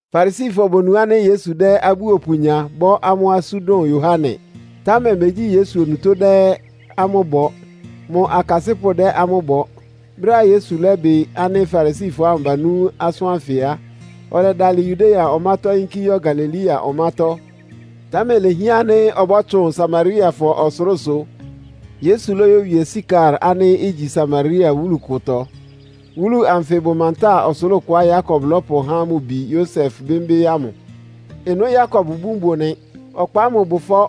Farisifɔ bonu ánɩ́ Yesu dɛ́ abúopʋ nya, bɔ́ amʋ́ asú dʋn Yohane. (Támɛ megyí Yesu onutó dɛ́ amʋ́ bɔ. Mʋ akasɩ́pʋ́ dɛ́ amʋ́ bɔ.) Brɛ́á Yesu lɛ́bɩ ánɩ́ Farisifɔ ámʋ banú asʋ́n ánfɩ á, ɔlɛdalɩ Yudea ɔmátɔ́ yínkí yɔ́ Galilea ɔmátɔ́. Támɛ lehián ánɩ́ ɔbɔ́tsʋn Samariafɔ ɔsʋlʋ́sʋ. Yesu lóyówie Sikar ánɩ́ igyi Samaria wúlu kʋtɔ. Wúlu anfɩ bʋ mantáa ɔsʋlʋ́ʋ kʋá Yakob lɔ́pʋhá mʋ bi Yosef bɩ́mbɩ́ ámʋ. Ɩnʋ́ Yakob ibún bʋ nɩ. Ɔkpa ámʋ bʋ ɩfɔ́.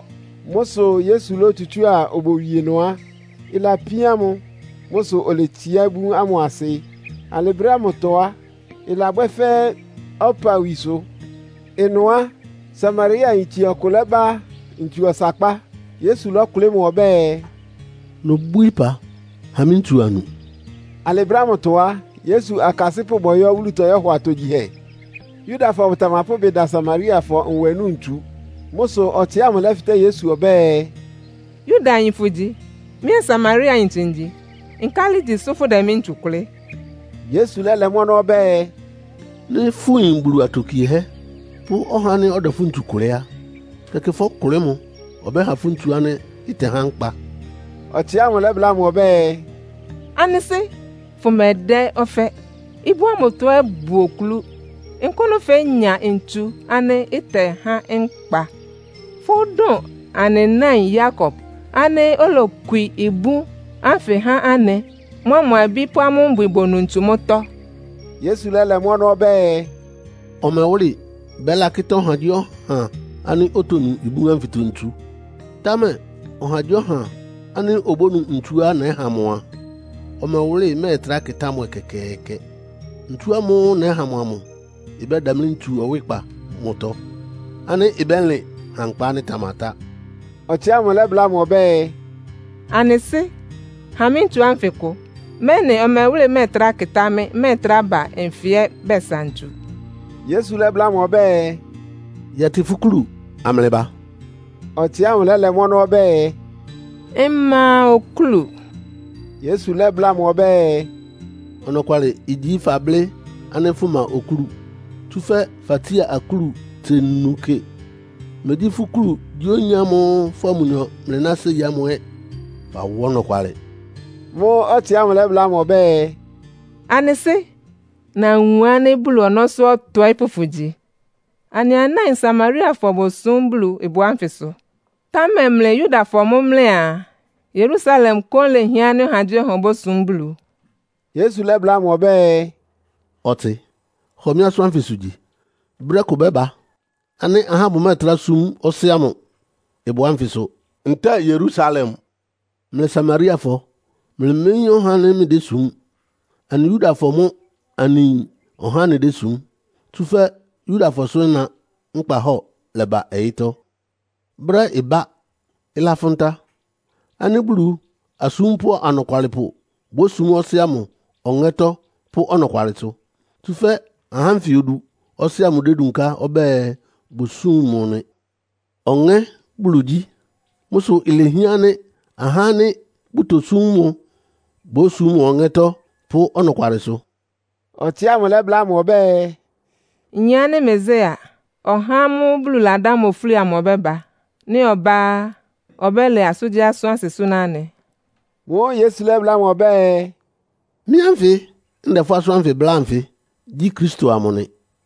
Mʋ́ sʋ Yesu lótsutsúa obowie ɩnʋ á, ɩlapíán mʋ. Mʋ́ sʋ oletsiá ibún ámʋ asɩ. Alɩ brɛ́ ámʋtɔ á, ɩlabwɛ́ fɛ́ ɔpawísʋ́. Ɩnʋ á, Samariayintse ɔkʋ lɛ́ba ntsu ɔsakpá. Yesu lɔ́kʋlɩ́ mʋ ɔbɛ́ɛ, “Nobwíí ɩpa, ha mɩ́ ntsu annu.” Alɩ brɛ́ ámʋtɔ á, Yesu akasɩ́pʋ́ bɔyɔ́ wúlutɔ yɔ́hɔ atogyihɛ. Yudafɔ bʋtamapʋ́ ɩbɩ da Samariafɔ nwɛ núu ntsu. Mʋ́ sʋ ɔtsɩ ámʋ lɛ́fɩtɛ́ Yesu ɔbɛ́ɛ, “Yudayin fʋgyi, mɩ́ ɛ́ Samariayintse ngyi. Nkálɩ igyi sʋ́ fʋdɛ mɩ́ ntsu kʋlɩ́?” Yesu lɛ́lɛ mʋ́ ɔnɔ́ ɔbɛ́ɛ, “Nɩ́ fʋyin Bulu atokiehɛ́ pʋ́ ɔhá ánɩ́ ɔdɛ fʋ́ ntsu kʋlɩ́ á, tɛkɩ fɔ́kʋlɩ́ mʋ, ɔbɛ́ha fʋ́ ntsu ánɩ́ ɩtɛhá nkpa.” Ɔtsɩ ámʋ lɛ́bláa mʋ ɔbɛ́ɛ, “Anɩ sɩ́, fʋmɛdɛ́ ɔfɛ́, ibún ánfɩtɔ ɛ́ bʋ oklú. Nkʋ́nʋ fénya ntsu ánɩ́ ɩtɛhá nkpa? Fʋ́dʋn anɩ náin Yakob ánɩ́ olokwi ibún ánfɩ há anɩ, mʋa mʋ abí pʋ́ amʋ́ mbwɩ bonu ntsu mʋ́tɔ́?” Yesu lɛ́lɛ mʋ́ ɔnɔ́ ɔbɛ́ɛ, “Ɔmɛwʋ́lɩ bɛ́lakɩ́tá ɔhagyíɔha ánɩ́ otonu ibún ánfɩtɔ ntsu. Támɛ ɔhagyíɔha ánɩ́ obónu ntsuá nɛ́ha mʋ a, ɔmɛwʋ́lɩ mɛ́ɛtrá kɩtá mʋ ɛkɛkɛɛkɛ. Ntsu ámʋ́ʋ́ nɛ́ha mʋ amʋ ɩbɛ́damlí ntsu ɔwɩ́kpa mʋtɔ ánɩ́ ɩbɛ́lɩn ha nkpa ánɩ́ ɩtamatá.” Ɔtsɩ ámʋ lɛ́bláa mʋ ɔbɛ́ɛ, “Anɩ sɩ́, ha mɩ́ ntsu ánfɩ kʋ, mɛ́nɩ ɔmɛwʋ́lɩ mɛ́ɛtrá kɩtá mɩ́, mmɛ́ɛtrá ba nfɩ ɛ́ bɛsa ntsu.” Yesu lɛ́bláa mʋ ɔbɛ́ɛ, “Yɛtɩ fʋ́ kúlu amlɩba.” Ɔtsɩ ámʋ lɛ́lɛ mʋ́ ɔnɔ́ ɔbɛ́ɛ, “Mma okúlu.” Yesu lɛ́bláa mʋ ɔbɛ́ɛ, “Ɔnɔkwalɩ igyi fablɩ́ ánɩ́ fʋma okúlu. Tsúfɛ́ fatsía akúlu tse nu kɩ. Mégyí fʋ́ kúlu gyí oyin ámʋ́ʋ́ fʋ́a mʋnyɔ mlɩná séi ámʋ ɛ́. Fawá ɔnɔkwalɩ.” Mʋ́ʋ́ ɔtsɩ ámʋ lɛ́bláa mʋ ɔbɛ́ɛ, “Anɩ sɩ́, nawun ánɩ́ Bulu ɔnɔ́sʋ́ ɔtɔɩ́pʋ́ fʋgyi. Anɩ anáin Samariafɔ bosúm Bulu ɩbʋ ánfɩsʋ, támɛ mlɩ Yudafɔ mʋ́ mlɩaa Yerusalem kóún lehián ánɩ́ ɔhagyíɔha obósum Bulu.” Yesu lɛ́bláa mʋ ɔbɛ́ɛ, “Ɔtsɩ, hɔ mɩ́ asʋ́n ánfɩsʋ gyi. Brɛ́ kʋ bɛ́ba ánɩ́ ahá bʋmɛ́ɛtrá súm Ɔsɩ́ ámʋ ɩbʋ ánfɩsʋ ntɛ́ɛ Yerusalem. Mlɩ Samariafɔ mlɩméyín ɔhá ánɩ́ mlɩdésum. Anɩ Yudafɔ mʋ́ anɩyin ɔhá ánɩ́ anɩdésum, tsúfɛ́ Yudafɔsʋ ɩna nkpahɔ́ɔ lɛba ɔyɩ́tɔ́. Brɛ́ ɩbá, ɩlafʋn ta ánɩ́ Bulu asúmpʋ́ anɔkwalɩpʋ bósum Ɔsɩ́ ámʋ ɔŋɛ́tɔ́ pʋ́ ɔnɔkwalɩsʋ. Tsúfɛ́ ahá ánfɩ odu Ɔsɩ́ ámʋ dédunká ɔbɛ́ɛ bʋsúm mʋ nɩ. Ɔŋɛ́ Bulu gyí. Mʋ́ sʋ ilehián ánɩ́ ahá ánɩ́ bʋtosúm mʋ bósum mʋ ɔŋɛ́tɔ́ pʋ́ ɔnɔkwalɩsʋ.” Ɔtsɩ ámʋ lɛ́bláa mʋ ɔbɛ́ɛ, “Nyin ánɩ́ Mesia, (ɔhá ámʋ́ʋ́ Bulu ladá mʋ ofúli amʋ) ɔbɛ́ba. Nɩ́ ɔbá á, ɔbɛ́lɛ asʋ́ngyíasʋ́n asɩ súná anɩ.” Mʋ́ʋ́ Yesu lɛ́bláa mʋ ɔbɛ́ɛ, “Mɩ́ ánfɩ ndɛ fʋ́ asʋ́n bláa anfɩ gyí Kristo amʋ nɩ.”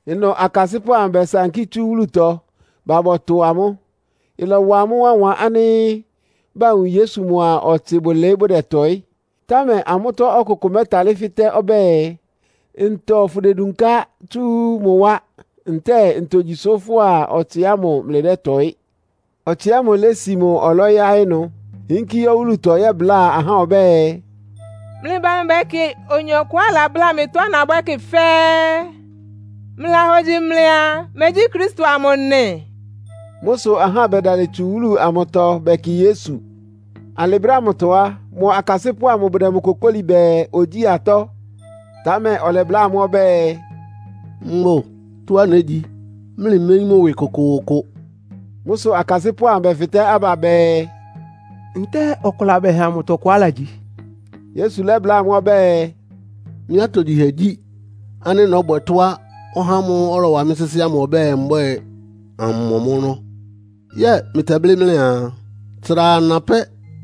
Ɩnʋ akasɩ́pʋ́ amʋ bɛsankí tsú wúlutɔ ba bɔtʋ amʋ́. Ɩlɔwa amʋ́ wánwan ánɩ́ bawun Yesu mʋa ɔtsɩ bʋlɩɩ́ bʋdɛtɔɩ́. Támɛ amʋ́tɔ́ ɔkʋkʋ mɛ́talɩ́ fɩtɛ́ ɔbɛ́ɛ, “Ntɔ fʋdedunká tsú mʋ wá, ntɛ́ɛ ntogyi sʋ́ fʋ́a ɔtsɩ ámʋ mlɩdɛ́tɔɩ́?” Ɔtsɩ ámʋ lési mʋ ɔlɔ́ yáɩ́ ɩnʋ, yínkí yɔ́ wúlutɔ yɛ́bláa ahá ɔbɛ́ɛ, “Mlɩba amlɩbɛkɩ oyin ɔkʋá alabláa mɩ tɔ́á nabwɛ́ kɩ fɛ́ɛ́. Mlɩlahogyi mlɩaa, megyí Kristo amʋ nɩ?” Mʋ́ sʋ ahá bɛdalɩ tsu wúlu amʋtɔ bɛkɩ Yesu. Alɩ brɛ́ ámʋtɔ á, mʋ akasɩ́pʋ́ ámʋ bʋdɛ mʋ kokóli bɛɛ, ogyíi atɔ́. Támɛ ɔlɛbláa amʋ́ ɔbɛ́ɛ, “Mbʋ tɔ́á négyi, mlɩméyín mʋ́ ɩwɩ kʋkʋʋkʋ.” Mʋ́ sʋ akasɩ́pʋ́ amʋ bɛfɩtɛ́ aba bɛɛ, “Ntɛ́ɛ ɔkʋ labɛha mʋ tɔkʋ alagyi?” Yesu lɛ́bláa amʋ́ ɔbɛ́ɛ, “Mɩ́ atogyihɛ gyí ánɩ́ nɔ́bwɛ tɔ́á ɔhá ámʋ́ʋ́ ɔlɔwa mɩ́ sɩ́sɩ́ ámʋ ɔbɛ́ɛ mbwɛ́ɛ, ammɔ mʋ́ ɔnɔ́. Yɛ́ɛ mlɩtɛblɩ́ mlɩaa, ‘Tsra ana pɛ́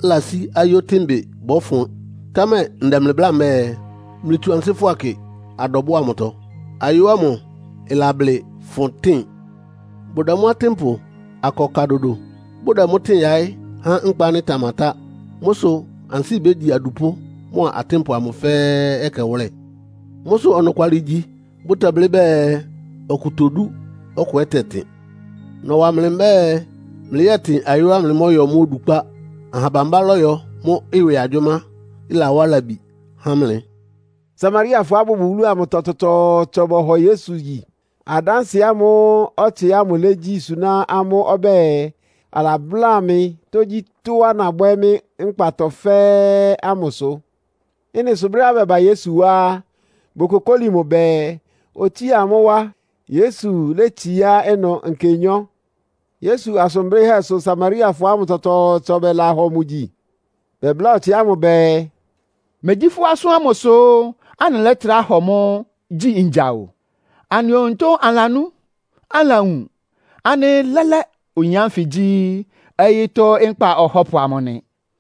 lasí ayó tɩ́nbɩ bɔ́fʋn?’ Támɛ ndɛ mlɩ bláa mbɛ́ɛ, mlɩtsu ansɩ́ kɩ adɔbʋ́ʋ amʋtɔ, ayó ámʋ ɩlablɩ fʋn tɩ́n. Bʋdɛ mʋ atɩ́npʋ akɔ ka dodo. Bʋdɛ mʋ́ tɩ́n yaɩ́ há nkpa ánɩ́ ɩtamatá. Mʋ́ sʋ ansɩ́ bégyi adupʋ́ mʋ́a atɩ́npʋ amʋ fɛ́ɛ́ ɛkɛwʋ́lɛ. Mʋ́ sʋ ɔnɔkwalɩ igyi bʋtɛblɩ́ bɛɛ, ‘Ɔkʋ todú, ɔkʋ ɛ́ tɛtɩn.’ Nɔwa mlɩ mbɛ́ɛ mlɩyɛ́tɩn ayóá mlɩmɔ́yɔ mʋ́ odukpá. Aha bambá lɔ́yɔ mʋ́ ɩwɩ agyʋ́má, ɩlawá labi há mlɩ.” Samariafɔá bʋbʋ wúlu amʋtɔ tsɔtsɔɔtsɔ bɔhɔ Yesu gyi, adánsɩɛ ámʋ́ʋ́ ɔtsɩ ámʋ légyi suná amʋ́ ɔbɛ́ɛ, “Alabláa mɩ tógyítɔ́á nabwɛ́ mɩ́ nkpatɔ fɛ́ɛ́” ámʋ sʋ. Ɩ́nɩ sʋ brɛ́á bɛba Yesu wá á, bokokóli mʋ bɛɛ, otsía amʋ́ wá. Yesu létsiá ɩnʋ nkenyɔ́. Yesu asʋn blɩ́hɛ́ sʋ Samariafɔ ámʋ tsɔtsɔɔtsɔ ɛ́ bɛlahɔ mʋ gyi. Bɛbláa ɔtsɩ ámʋ bɛɛ, “Megyí fʋ́ asʋ́n ámʋ sʋ́ anɩlɛ́trá hɔ mʋ gyi ngya o. Anɩ onutó anɩlanú, anɩlawun ánɩ́ lɛ́lɛ́ oyin ánfɩ gyí ɔyɩ́tɔ́ Nkpa Ɔhɔ́pʋ amʋ nɩ.”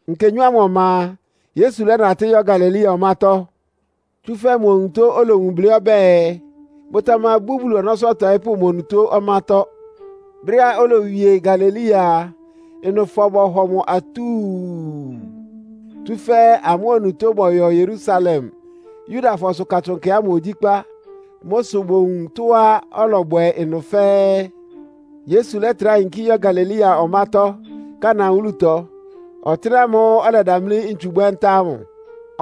Nkenyɔ́ ámʋ ɔma a, Yesu lɛ́natɩ́ yɔ́ Galilea ɔmátɔ́. (Tsúfɛ́ mʋ onutó olowun blɩ́ ɔbɛ́ɛ, “Bʋtamabú Bulu ɔnɔ́sʋ́ ɔtɔɩ́pʋ́ mʋ onutó ɔmátɔ́.”) Brɛ́á olowie Galilea a, ɩnʋfɔ bɔhɔ mʋ atúu, tsúfɛ́ amʋ́ onutó bɔyɔ Yerusalem Yudafɔsʋ Katsʋn Nkɛ ámʋ ogyíkpá. Mʋ́ sʋ bowun tɔ́á ɔlɔbwɛ ɩnʋ fɛ́ɛ́. Yesu lɛ́trá yinkí yɔ́ Galilea ɔmátɔ́, Kana wúlutɔ, ɔtɩ́nɛ́ ámʋ́ʋ́ ɔlɛdamlí ntsu bwɛ́ ntá ámʋ.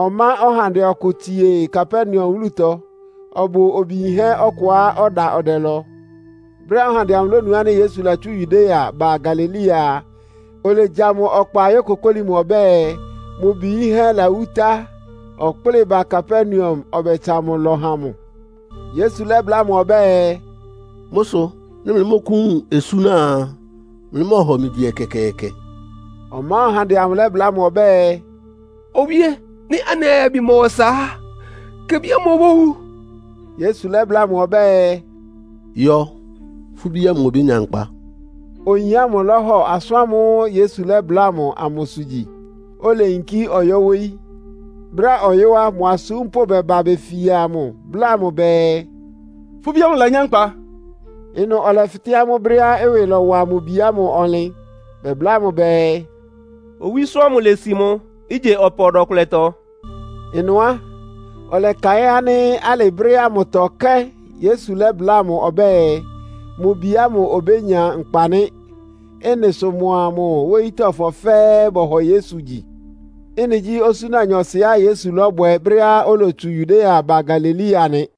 Ɔmá ɔhandɛ ɔkʋ tsie Kapernaum wúlutɔ. Ɔbʋ obi yinhɛ́ ɔkʋá ɔda ɔdɛlɔ. Brɛ́á ɔhandɛ amʋ lónu ánɩ́ Yesu latsú Yudea ba Galilea a, olegya mʋ ɔkpa yókokóli mʋ ɔbɛ́ɛ, mʋ bi yínhɛ́ lawú tá, ɔkplɩ́ɩ ba Kapernaum, ɔbɛtsa mʋ ɩlɔ ha mʋ. Yesu lɛ́bláa mʋ ɔbɛ́ɛ, “Mʋ́ sʋ nɩ́ mlɩmɔ́kʋ́wun osúna a, mlɩmɔ́ɔhɔ mɩ gyi ɛkɛkɛɛkɛ?” Ɔmá ɔhandɛ amʋ lɛ́bláa mʋ ɔbɛ́ɛ, “Owíé! Nɩ́ anɩ ayabi mɔwa ɔsa á, kebi ámʋ obówu.” Yesu lɛ́bláa mʋ ɔbɛ́ɛ, “Yɔ! Fʋ́ bí ámʋ obénya nkpa!” Oyin ámʋ lɔ́hɔ asʋ́n ámʋ́ʋ́ Yesu lɛ́bláa mʋ amʋsʋ gyi, oleyinkí ɔyɔ́ wóyí. Brɛ́á ɔyɔ́ á, mʋ asúmpʋ́ bɛba befia mʋ, bláa mʋ bɛɛ, “Fʋ́ bí ámʋ lanyá nkpa.” Ɩnʋ ɔlɛfɩtɛ́ amʋ́ brɛ́á ɩwɩ lɔ́wa mʋ bi ámʋ ɔnlɩn. Bɛbláa mʋ bɛɛ, “Owísó ámʋ lési mʋ ígye ɔpa ɔdɔ-kʋlɛtɔ.” Ɩnʋ á, ɔlɛkaɩ́n ánɩ́ alɩ brɛ́ ámʋtɔ kɛ́n Yesu lɛ́bláa mʋ ɔbɛ́ɛ, mʋ bi ámʋ obénya nkpa nɩ́. Ɩ́nɩ sʋ mʋa mʋ wóyítɔ́fɔ fɛ́ɛ́ bɔhɔ Yesu gyi. Ɩ́nɩ gyí osúna nyɔɔsɩá Yesu lɔ́bwɛ brɛ́á olotsu Yudea ba Galilea nɩ.